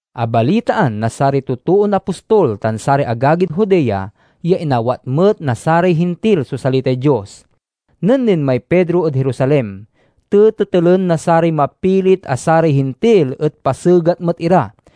Abalitaan na saray totoon apostol tan saray agagid Judea ya inawat met na saray Hintil so salitay Dios. Nen linmay Pedro ed Jerusalem, tetetelen na saray mapilit a saray Hintil et pasegat met ira.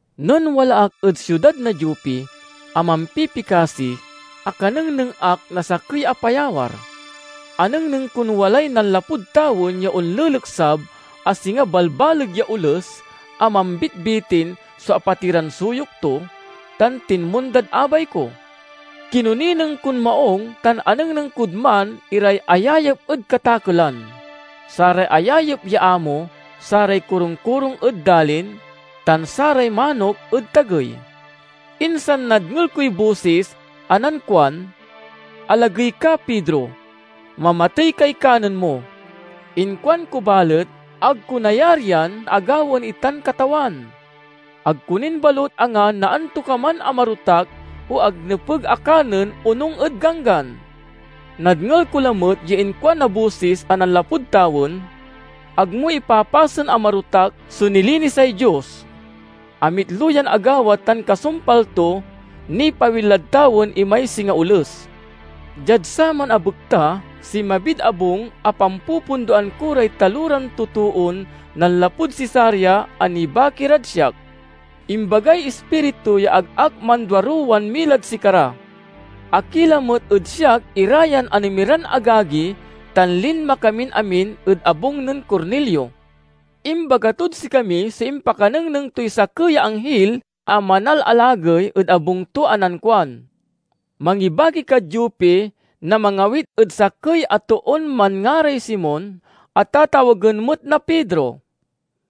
"Nen wala ak ed siudad na Jope a mampipikasi, akanengneng ak na sakey a payawar. Anengneng kon walay nanlapud tawen ya onleleksab a singa balbaleg ya oles a mambitbitin so apatiran suyok to, tan tinmondad abay ko. Kinonineng kon maung tan anengneng kod man iray ayayep ed katakelan, saray ayayep ya amo saray korungkorung ed dalin, tan saray manok ed tagey. Insan nadngel koy bosis a nankuan, 'Alagey ka, Pedro; mamatey kay kanen mo!' Inkuanko balet, 'Ag ko nayarian a gawaen itan, Katawan! Ag ko nin balut angan na antokaman a marotak o ag nepeg a kanen onung ed ganggan.' Nadngel ko lamet ya inkuan na bosis a nanlapud tawen, 'Ag mo ipapasen a marotak so nilinisay Dios.' Amitlo yan agawa tan kasumpal to, nipawil lad tawen imay singa oles. Diad saman a bekta, sinmabid abung a pampupundoan ko ray taloran totoon nanlapud Cesarea a nibaki rad siak. Imbagay Ispiritu ya ag ak manduaruwan milad sikara. Akila met ed siak ira yan anemiran agagi tan linma kamin amin ed abung nen Cornelio. Imbaga tod sikami so impakanengneng toy sakey ya anghil a manalalagey ed abung to a nankuan, 'Mangibaki kad Jope na mangawit ed sakey a toon manngaray Simon a tatawagen met na Pedro.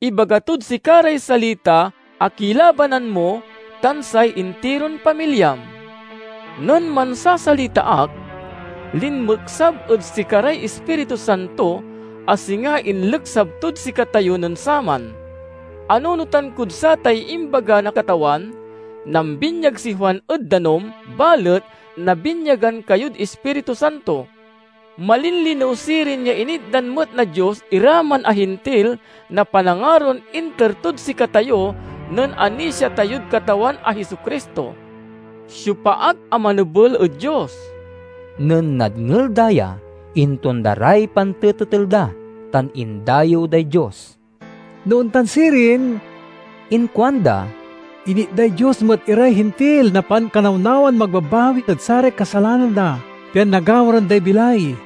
Ibaga tod sika ray salita a kilabanan mo tan say intiron pamilyam.' Nen mansasalita ak, linmeksab ed sikaray Ispiritu Santo a singa inleksab tod sikatayo nen saman. Anunotan kod satay imbaga na Katawan, 'Nambinyag si Juan ed danum, balet nabinyagan kayod Ispiritu Santo.' Malinlinew sirin ya initdan met na Dios ira man a Hintil na panangaron inter tod sikatayo nen anisia tayod Katawan a Jesu-Cristo. Siopa ak a manebel ed Dios?" Nen nadngel da ya, intonda ray pantetetel da tan indayew day Dios. "No ontan sirin," inkuanda, "initday Dios met iray Hintil na pankanawnawan magbabawi ed saray kasalanan da, pian nagamuran day bilay!"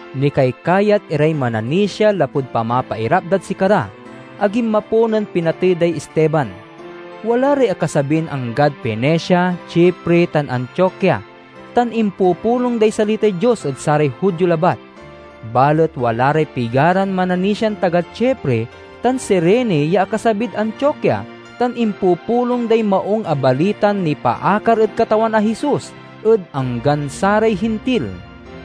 Nikaykayat iray mananisia lapud pamapairap dad sikara, a ginmapo nen pinatey day Esteban. Wala ray akasabin anggad Fenicia, Chipre, tan Antiokia, tan impupulong day salitay Dios ed saray Judio labat. Balet wala ray pigaran mananisian taga Chipre tan Cirene ya akasabid Antiokia tan impupulong day Maung a Balitan nipaakar ed Katawan a Jesus ed anggan saray Hintil.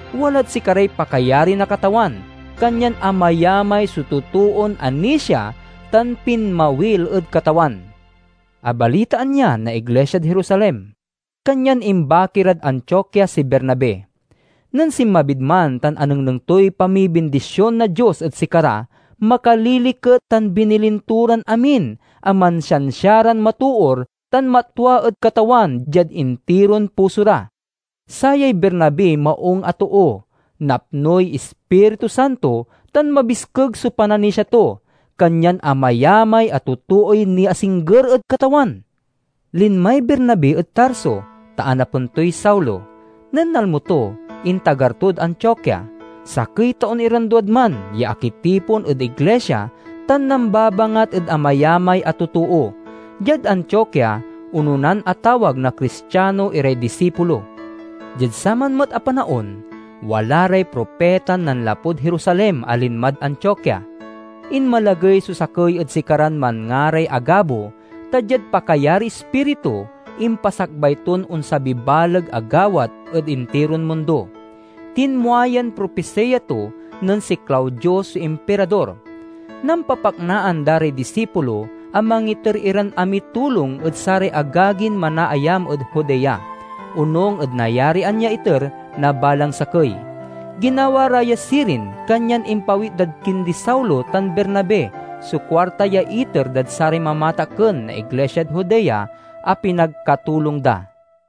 Walad sikaray pakayari na Katawan, kanyan amayamay so totoon anisia tan pinmawil ed Katawan. Abalitaan ya na iglisiad Jerusalem, kanyan imbaki rad Antiokia si Bernabe. Nen sinmabid man tan anengneng toy pamibindision na Dios ed sikara makaliliket, tan binilin to ran amin a mansiansia ran matoor tan matwa ed Katawan diad intiron puso ra. Sayay Bernabe maung a too, napnoy Ispiritu Santo tan mabiskeg so pananisia to. Kanyan amayamay a totooy niasingger ed Katawan. Linmay Bernabe ed Tarso, ta anapen toy Saulo. Nen nalmo to, intagar tod Antiokia. Sakey taon iran duad man ya akitipon ed iglisia tan nambabangat ed amayamay a totoo. Diad Antiokia, ononan atawag na Cristiano iray disipulo. Diad saman met a panaon, wala ray propitan nanlapud Jerusalem a linmad Antiokia. Inmalagey so sakey ed sikaran manngaray Agabo ta, diad pakayariy Ispiritu, impasakbay ton onsabiy baleg a gawat ed intiron mundo. (Tinmua yan propisiya to nen si Claudio so Impirador.) Nampapaknaan da ray disipulo a mangiter iran amiy tulong ed saray agagin manaayam ed Judea, onung ed nayarian ya iter na balang sakey. Ginawa ra ya sirin, kanyan impawit dad kindi Saulo tan Bernabe so kuarta ya iter dad saray mamatakken na iglisiad Judea a pinagkatulong da.